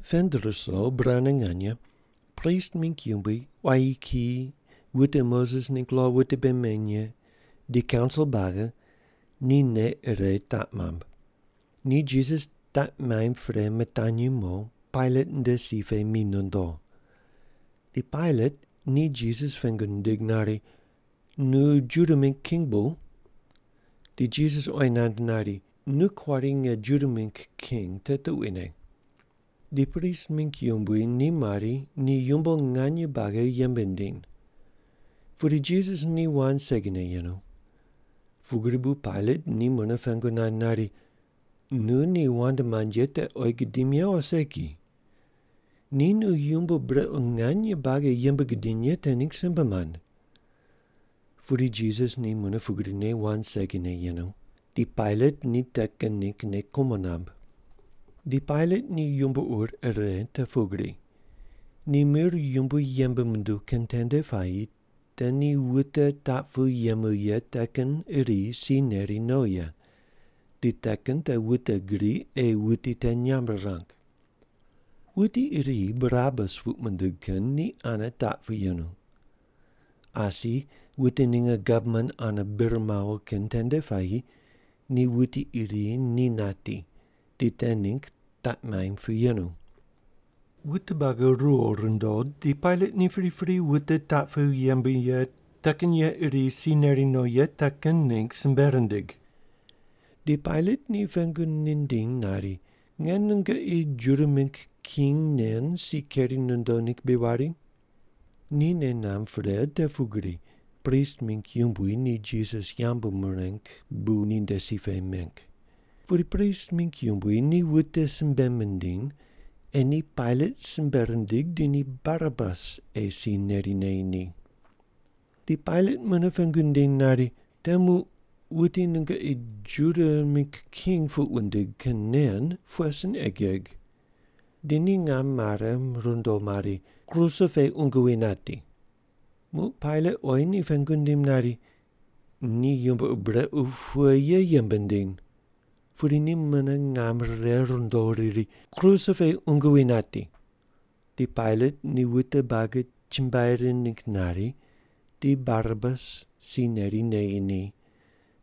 Pend ruso burane nganye prist mingg yumbui, quayi kiyi, wute Moses ningg lo wute bei meny ye, di kaunsil buagi ni nei ire taq mamb. Ni Jisas taq maimb pre mitanyi mo Pailat nde si pe mi nondo. Di Pailat ni Jisas pengu nindig nari, “Nu Juda mingg king bu?” Di Jisas oyi nand nari, “Nu kuari nge Juda mingg king, te tuquine.” Di prist mingg yumbui ni mari ni yumbo nganye buagi yembe nindiny. Pudi Jisas ni wand segine yenu. Pugri bu Pailat ni mune pengu nand nari, “Nu ni wand mand ye te oyi gudim ye o segi? Ni nu yumbo brequ nganye buagi yembe gudiny ye te ningg simbe mand.” Pudi Jisas ni mune pugrine wand segine yenu, di Pailat ni te kin ningg nei kumo namb. Di Pailat ni yumbo ur ire te pugri, ni mir yumbui yembe munduw kin tende puayi te ni wute taq pu yemu ye te kin iri si neri no ye, di te kin te wute gri ei wuti te nyamb rirang. Wuti iri Barabas puq mindig kin ni ane taq pu yenu. Asi wute ninge gavman ane bir mawo kin tende puayi ni wuti iri ni nati di te ningg taq maimb pu yenu. Wute buagi riwo rundo di Pailat ni pripri wute taq pu yemu ye te kin ye iri si neri no ye te kin ningg simbe rindig. Di Pailat ni pengu nindiny nari, “Nge nungoqi Juda mingg king nen si keri nondo ningg bri wari?” Ni nei namb pre te pugri prist mingg yumbui ni Jisas yambu mireng bu ninde si pe meng. Pudi prist mingg yumbui ni wute simbe mindiny ei ni Pailat simbe rindig di ni Barabas ei si neri neyi ni. Di Pailat mune pengu nindiny nari, “Te muq wuti nungoqi Juda mingg king puq wundig kin nen pughe sin ei geg?” Di ni ngam mare rundo mari, “Kruse pe qungu wi nati.” Muq Pailat oyi ni pengu nindim nari, “Ni yumbo ur brequ pughe ye yembe nindiny?” Pudi ni mune ngam rire rundo riri, “Kruse pe qungu wi nati.” Di Pailat ni wute buagi chumbuai rind ningg nari di Barabas si neri neyi ni,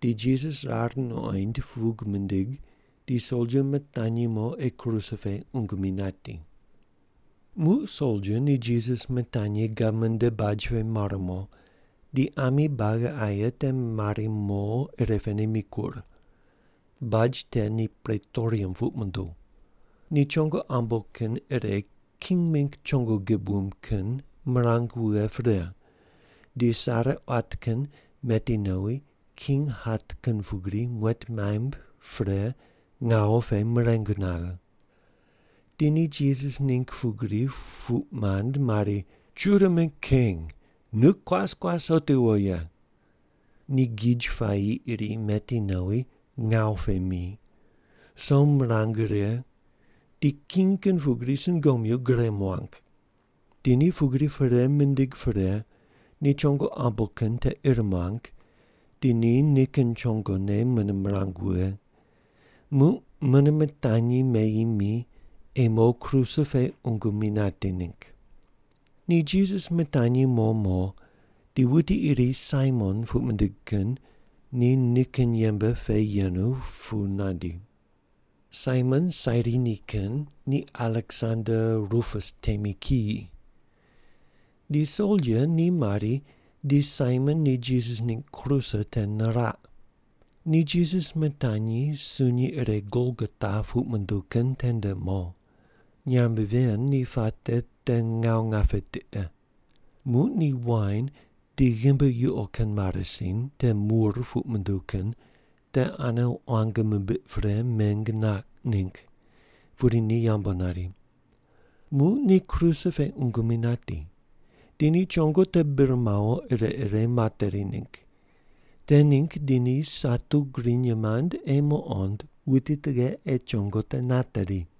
di Jisas rar nuqoind pug mindig di soldia mitanyi mo ei kruse pe qungu mi nati. Muq soldia ni Jisas mitanyi gavman nde baj pe mar mo, di ami buagi aye te mari mo irepene mikur. (Baj te ni pretorium puq munduw.) Ni chongo ambo kin ire king mingg chongo gib wumb kin mirang wughe pre, di sare quat kin meti nowi king hat kin pugri muet maimb pre ngawu pe mireng naghe. Di ni Jisas ningg pugri puq mand mari, “Juda mingg king, nu kuas kuas otiwo ye.” Ni gij puayi iri meti nowi ngawu pe mi, som mirang righe di king kin pugri sungomyu gure muang. Di ni pugri perei mindig pre ni chongo ambo kin te ir muang di ni nikin chongone mune mirang wughe. Muq mune mitanyi meyi mi ei mo kruse pe qungu mi nati ningg. Ni Jisas mitanyi mo mo di wuti iri Saimon puq mindig kin ni nikin yembe pe yenu pu nandi. Saimon Sairini kin ni Aleksander Rupus temi kiyi. Di soldia ni mari di Saimon ni Jisas ningg kruse te niraq. Ni Jisas mitanyi sunyi ire Golgota puq munduw kin tende mo. (Nyamb ven ni puate te ngawu ngape tiqe.) Muq ni wain di ghimbi yuqo kin marasin ire mur puq munduw kin te ane quang mimbiq pre meng naq ningg, pudi ni yambu nari. Muq ni kruse pe qungu mi nati. Di ni chongo te bir mawo ire ire materi ningg. Te ningg di ni satu griny mand ei muqond wuti tughe ei chongo te nateri.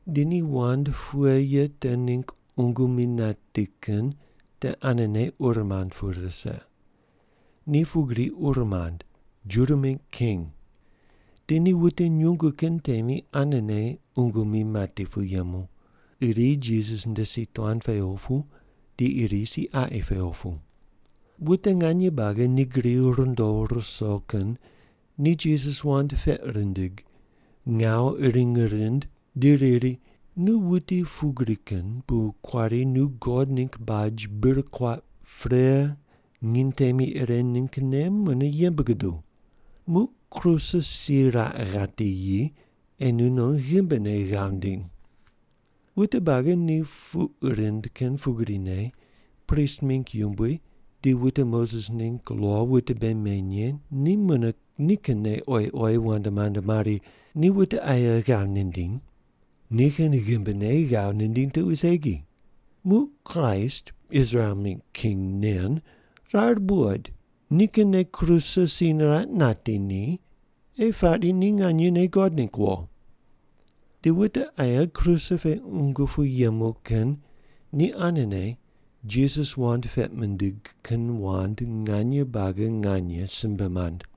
Di ni wand pughe ye te ningg qungu mi nati kin te anene ur mand pu rise. Ni pugri ur mand, “Juda mingg king.” Di ni wute nyungu kin temi anene qungu mi mati pu yemu, iri Jisas nde si tuan pe opu di iri si qaqi pe opu. Wute nganye buagi te gri rundo ruso kin ni Jisas wand peq rindig, ngawu uring rind di riri, “Nu wuti pugri kin bu kuari nu God ningg baj bir kuaq pre nginy temi ire ninggne mune yembe guduw. Muq kruse si raq ghati yi ei nunon ghimbine ghav ndiny.” Wute buagi ni puq rind kin pugrine prist mingg yumbui di wute Moses ningg lo wute bei meny ye ni mune nikinne oyi oyi wand mand mari, “Ni wute aye ghav nindiny, nikin ghimbine ghav nindiny tuqui segi. Muq Kraist Israel mingg king nen rar buqoid nikinne kruse si niraq nati ni ei pari ni nganyene God ningg wo.” Di wute aye kruse pe qungu pu yemu kin ni anene Jisas wand peq mindig kin wand nganye buagi nganye simbe mand.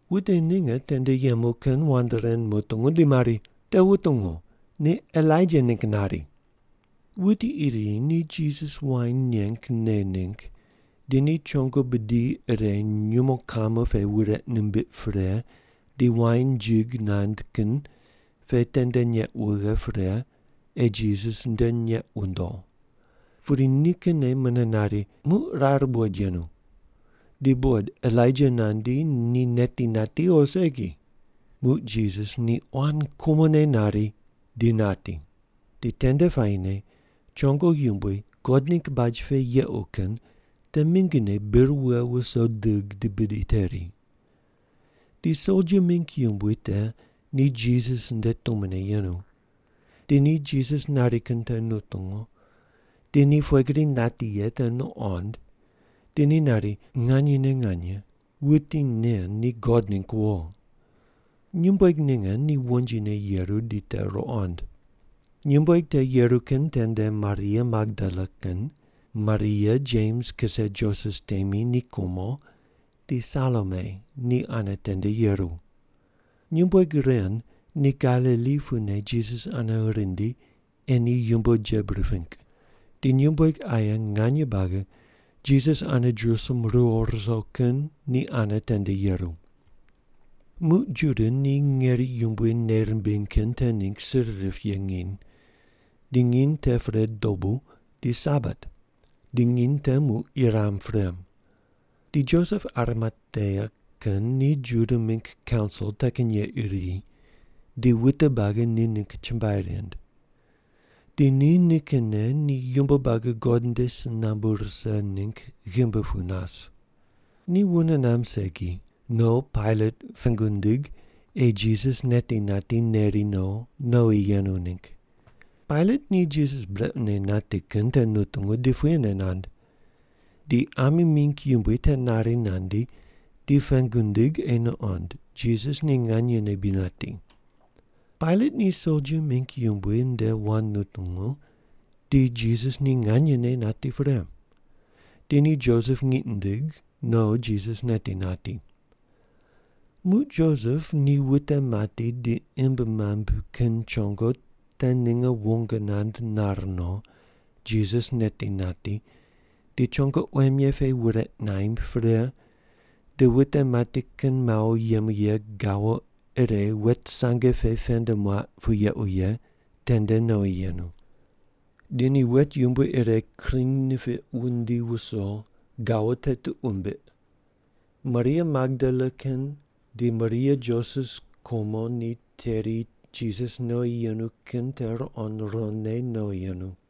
Wute ninge tende yemu kin wand ren mutungu di mari, “Te wutungu, ni Elaija ningg nari.” Wuti iri ni Jisas wain neng ne ningg di no chongo bidi ire nyumo kamo pe wureq nimbiq pre di wain jig nand kin pe tende neq wughe pre ei Jisas nde neq wundo. Pudi nikinne mune nari, “Muq rar buqoid yenu, di buqod Elaija nandi ni neti nati o segi.” Muq Jisas ni quan kumone nari, di nati. Di tende puayine chongo yumbui God ningg baj pe yequ kin te mingine bir wughe wuso dig di bidi teri. Di soldia mingg yumbui te ni Jisas nde tumone yenu. Di ni Jisas nari kin te nutungu di ni pughe gri nati ye te nuqond di ni nari, “Nganyene nganye, wuti nen ni God ningg wo.” Nyumbueg ninge ni wonjine yeru di te ruqond. Nyumbueg te yeru kin tende Maria Magdala kin, Maria Jems kise Joses temi ni kumo di Salome ni ane tende yeru. Nyumbueg ren ni Galili pune Jisas ane rindi ei ni yumbo jeb riping. Di nyumbueg aye nganye buagi Jisas ane Jerusalem riwo ruso kin ni ane tende yeru. Muq Juda ni ngeri yumbui nei rimbiny kin te ningg sir rip ye nginy, di nginy te pre dobu di Sabat. Di nginy te muq yuram pre. Di Josep Arimatea kin ni Juda mingg kaunsil te kin ye iri di wute buagi ni ningg chumbuai rind. Di ni nikinne ni yumbo buagi God nde si nambu rise ningg ghimbi pu nas. Ni wune namb segi, no Pailat pengu nindig ei Jisas neti nati neri no nowi yenu ningg. Pailat ni Jisas brequne nati kin te nutungu di puyene nand. Di ami mingg yumbui te nari nandi di pengu nindig ei nuqond Jisas ni nganyene bri nati. Pailat ni soldia mingg yumbui nde wand nutungu di Jisas ni nganyene nati pre, di ni Josep ngiq nindig no Jisas neti nati. Muq Josep ni wute mati di imb mamb kin chongo te ninge wong nand nare no, Jisas neti nati di chongo quem ye pe wureq naimb pre, di wute mati kin mawo yemu ye gawo ire wet sange pe pend muaq pu yequ ye tende nowi yenu. Di ni wet yumbui ire kring nipiq wundi wuso, gawo te tuq wumbiq. Maria Magdala kin di Maria Joses kumo ni teri Jisas nowi yenu kin te ruqond ruqondne nowi yenu.